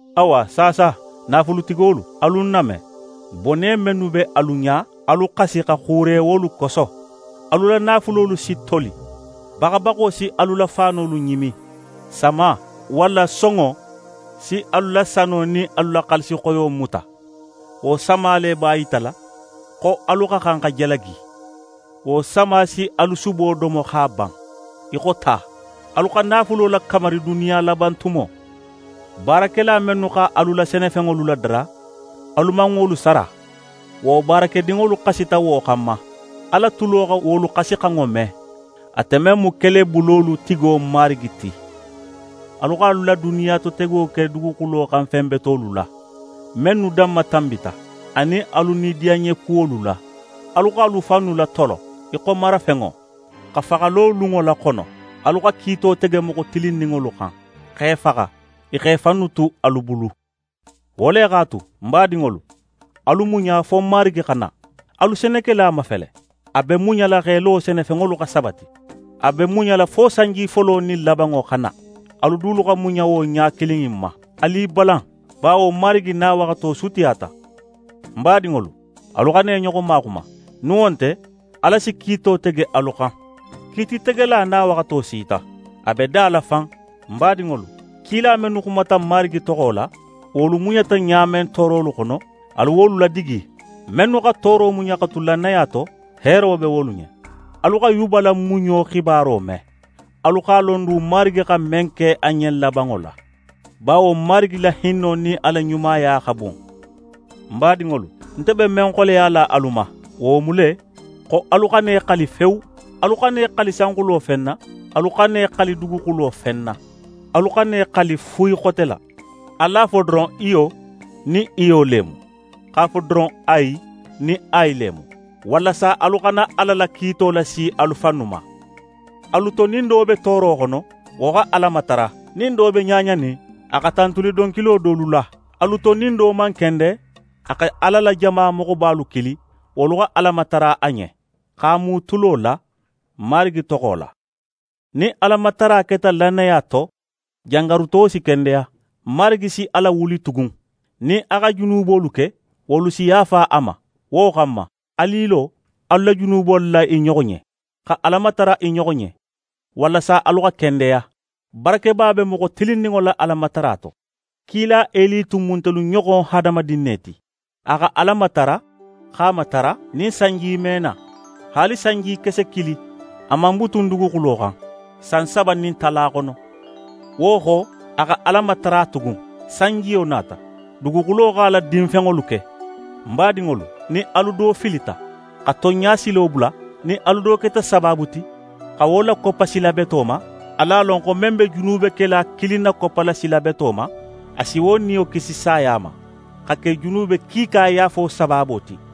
Awa saasa, naafulutigolu, alu ń name. Bone mennu be alu ɲa, alu xasi xa xuure wolu koso. Alu la naafulolu si toli, baxabaxo si alu la faanolu ɲimi. Sama, walla sonŋo si alu la sano nin alu la xaalisixoyo muta. Wo sama le b'a yitala xo alu xa xan xa jalagi. Wo sama si alu subo domo x'a ban, í xo ta. Alu xa naafulo lakamari duniya laban tumo. Baarakela mennu x'alu la senefenŋolu ladara, alu man wolu sara. Wo baarakedinŋolu xasita wo xanma, Ala tulo xa wolu xasixanŋo me, ate men mu Kelebulolu tigo Marigi ti. Alu x'alu la duniyatotego ke duguxulo xan fen betolu la, mennu danmatanbita, anin alu nidiyanɲekuwolu la. Alu x'alu fannu latolo í xo marafenŋo, xa faxalo lunŋo laxono. Alu xa kiito tege moxo tilinninŋolu xan, x'e faxa. I x'e fannu tu alu bulu. Wo le x'a tu, ń badinŋolu, alu muɲa fo Marigi xa na. Alu senekela mafele: A be muɲala x'é lo senefenŋolu xa sabati. A be muɲala fo sanji folo nin labanŋo xa na. Alu dulu xa muɲa wo ɲa kilin in ma. Alu i balan, bawo Marigi nawaxato sutiyata. Ń badinŋolu, alu xana i ɲoxo maxuma; nin wo nte, Ala si kiito tege alu xan. Kiititegela nawaxato sita, a be da la fan. Ń badinŋolu, kila mennu xumata Marigi toxo la, wolu muɲata ɲa men toorolu xono, alu wolu ladigi. Mennu xa tooro muɲa xa tu lannaya to, heero be wolu ɲen. Alu xa Yuba la muɲo xibaro me. Alu x'a lon du Marigi xa men ke a ɲen labanŋo la; bawo Marigi la hinno nin a la ɲumaya xa bun. Ń badinŋolu, nte be men xoleyala alu ma, wo mu le, xo alu xana i xali fewu. Alu xana i xali sanxulo fen na, alu xana i xali duguxulo fen na. Alu xana i xali fuyi xote la. Alu a fo doron «iyo», nin iyo le mu, x'a fo doron «ayi» nin ayi le mu, walasa alu xana Ala la kiito lasi alu fannu ma. Alu to, nin do be tooro xono, wo xa Ala matara. Nin do be ɲaɲanin, a xa tantuli donkilo dolu la. Alu to, nin do man kende, a xa Ala la jama moxobalu kili wolu xa Ala matara a ɲen, x'a mu tulo la Marigi toxo la. Nin Alamatara keta lannaya to, jangaruto si kendeya. Marigi si a lawuli tugun. Nin a xa junubolu ke, wolu si yaafa a ma. Wo xanma, alu i lo alu la junubolu la i ɲoxo ɲen, xa Ala matara i ɲoxo ɲen, walasa alu xa kendeya. Barakeba be moxo tilinninŋo la Alamatara to. Kila Eli tun mu ntelu ɲoxon hadamadin ne ti. A xa Ala matara, x'a matara nin sanji me na. Haali sanjikese kilin, a man butun duguxulo xan san saba nin tala xono. Wo xo, a xa Ala matara tugun. Sanjiyo nata, duguxulo x'a la dinfenŋolu ke. Ń badinŋolu, nin alu do filita, xa tonɲa silo bula, nin alu do keta sabaabu ti xa wo lakoppa sila beto ma, alu a lon xo men be junubekela kilin nakoppala sila beto ma, a si wo niyo kisi saya ma, xa ke junube kiika yaafo sabaabo ti.